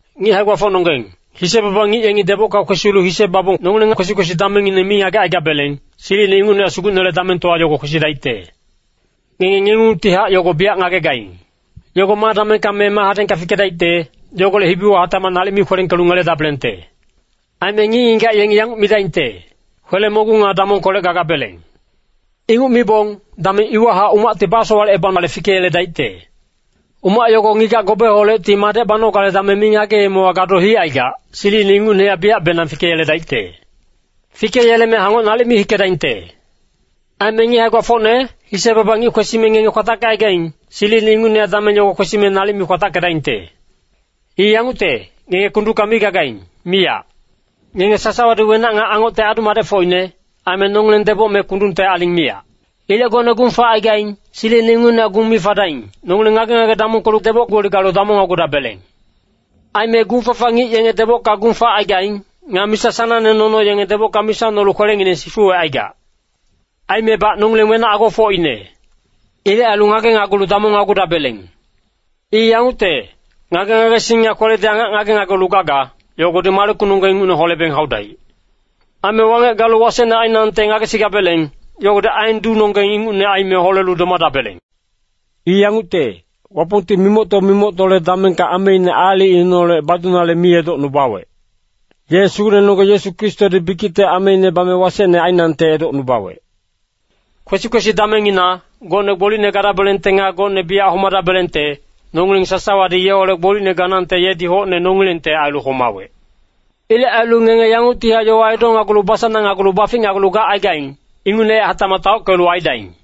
Ngic hae-gbafocnonggeng, hise-baba ngic yengi debocka kwesilu hise babong nongileng kwesi-kwesi damengngineng mi ngagecaigabeleng, silicine ingucnehac Sugucnele damengtowa yogo kwesidaicte. Ngenge ngengungtihac yogo biyac ngagegaing. Yogo ma damengka me ma hadengka fikedaicte, yogolec hibiwa hatacmac nalic mi kwelengkelu ngeledabelengte. Aime ngic-ngigac yengi yanguc midaingte, “Kwele-mogung nga damongkolec gagabeleng.” Inguc mibong, dameng iwahac umacti basowalecebanale fikeyeledaicte. Umac yogo ngigac gobeholecti madec banogale dameng mi ngageemewa gado hicaigac, silicine ingucnehac biyacbenang fikeyeledaicte. Fikeyeleme hangoc nalic mi hikedaingte. Aime ngic hae-gbafocne, hise-baba ngic kwesime ngenge kwatackecaigaing, silicine ingucnehac dameng yogo kwesime nalic mi kwatackedaingte. I yangucte, ngenge kundungka mi gagaing, miyac. Ngenge sasawadi wenac nga angocte adu-madecfocine, aime nongileng deboc me kundungte aling miyac. Ilec gocne gung facaigaing, silicine ingucnehac gung mi fadaing. Nongileng ngage-ngage damongkelu deboc-gboli galu damongnagudabeleng. Aime gung-fafa ngic yenge debocka gung facaigaing. Nga misa sanangne nono yenge debocka misa nolu kwelengineng sifuwecaigac. Aimebac nongileng wenac agofocine. Ilec ailu ngagenagulu damongnagudabeleng. I yangucte, ngage-ngagesing nga kweledi angac ngagenagulu gaga, yogodi malekunonggeng ingucne holebeng haudaic. Aime wangec galu wasecne ainangte ngagesigabeleng, yogodi aen duunonggeng ingucne aime holelu domadabeleng. I yangucte, Wapongti mimocto-mimoctole damengka ameine aalicineholec badunale mi edocnubawec. Ye Sugucnenonggeng Yesu Kristodi bikicte ameine bame wasecne ainangte edocnubawec. Kwesi-kwesi damengina, gocne gbolicne gadabelengte nga gocne biyac homadabelengte, nongileng sasawadi yeholec gbolicne ganangte yedi hocne nongilengte ailu homawec. Ilec ailu ngenge yanguctihac yowa edonagulu basanangnagulu baficnagulu gacaigaing, ingucnehac hatacmac taockelu aidaing.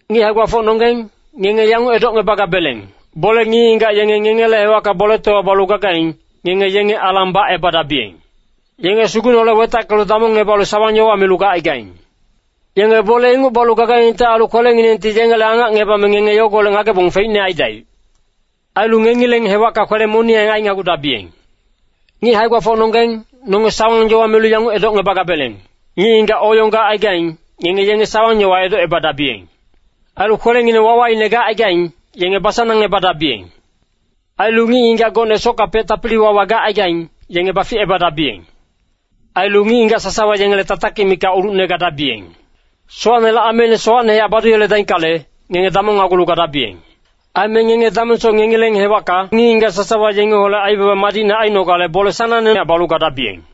Ngic hae-gbafocnonggeng, ngenge yanguc edocngebagabeleng, bole ngic-ngigac yenge ngengele hewacka boletowa balu gagaing, ngenge yenge alang bacebadabiyeng. Yenge Sugucneholec wetackelu damongngebalu sawang-yowa milu gacaigaing. Yenge bole inguc balu gagaingte ailu kwelenginengti yengele angacngebame ngenge yogolec ngagebong feicne aidaic. Ailu ngengileng hewacka kwele-moniyang ainagudabiyeng. Ngic hae-gbafocnonggeng, nonge sawang-yowa milu yanguc edocngebagabeleng, ngic-ngigac oyong gacaigaing, ngenge yenge sawang-yowa edocebadabiyeng. Ailu kwelengineng wawaine gacaigaing, yenge basanangebadabiyeng. Ailu ngic-ngigac gocne sockapec tapili-wawa gacaigaing, yenge baficebadabiyeng. Ailu ngic-ngigac sasawa yengele tatakic mikac ulucne gadabiyeng. Sowacnele ameine sowacnehac badungeledaickale, ngenge damongnagulu gadabiyeng. Aime ngenge damengsoc ngengileng hewacka ngic-ngigac sasawa yengeholec aibaba madicne ainogale bole sanangnehac balu gadabiyeng.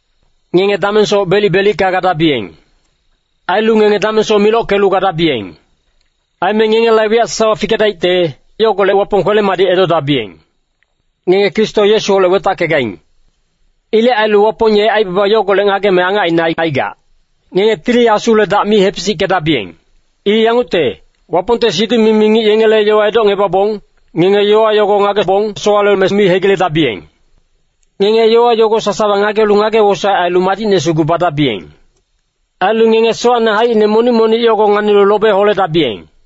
Ngenge damengsoc belic-belicka gadabiyeng. Ailu ngenge damengsoc milockelu gadabiyeng. Aime ngengela wiyac sasawa fikengeledaicte, yogolec Wapong kwele-madic edodabiyeng. Ngenge Kristo Yesuholec wetackegaing. Ilec ailu Wapong ye aibaba yogolec ngageme angacine aicaigac. Ngenge Tili Asule dac mi hepisickedabiyeng. I yangucte, Wapongte siduc-mimi ngic yengele yowa edocngebabong, ngenge yowa yogo ngagebong sowaleme mi hegiledabiyeng. Ngenge yowa yogo sasawa ngagelu ngage-wosaec ailu madicne sugu badabiyeng. Ailu ngenge sowacne haicine monic-monic yogo nganilu lobe holedabiyeng.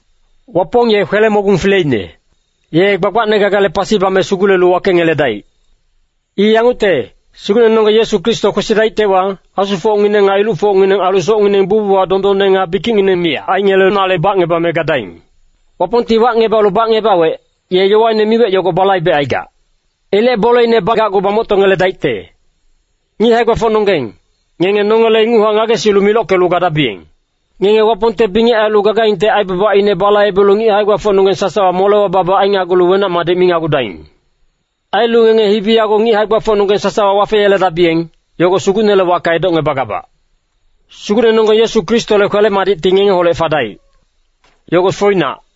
Wapong ye kwele-mogung fileine. Ye gbagbacne gagale pasi bame sugulelu wakengeledaic. I yangucte, Sugucnenonggeng Yesu Kristo kwesidaictewa, asufocngineng nga ilucfocngineng ailu socngineng bucbuchac dondonne nga bikicngineng miyac aingelenale bacngebame gadaing. Wapongti wacngebalu bacngebawec, ye yowaine miwec yogo balaibecaigac. Ilec boleine bagacgu bamoctongeledaicte. Ngic hae-gbafocnonggeng, ngenge nongele inguchac ngagesilu milockelu gadabiyeng. Ngenge Wapongte bingec ailu gagaingte aibabaine balaibelu ngic hae-gbafocnonggeng sasawa molewa babac ainagulu wenac-madic minagudaing. Ailu ngenge hibi yago ngic hae-gbafocnonggeng sasawa wafeyeledabiyeng, yogo Sugucnele wacka edocngebagabac. Sugucnenonggeng Yesu Kristole kwele-madicti ngengeholec fadaic. Yogo foinac.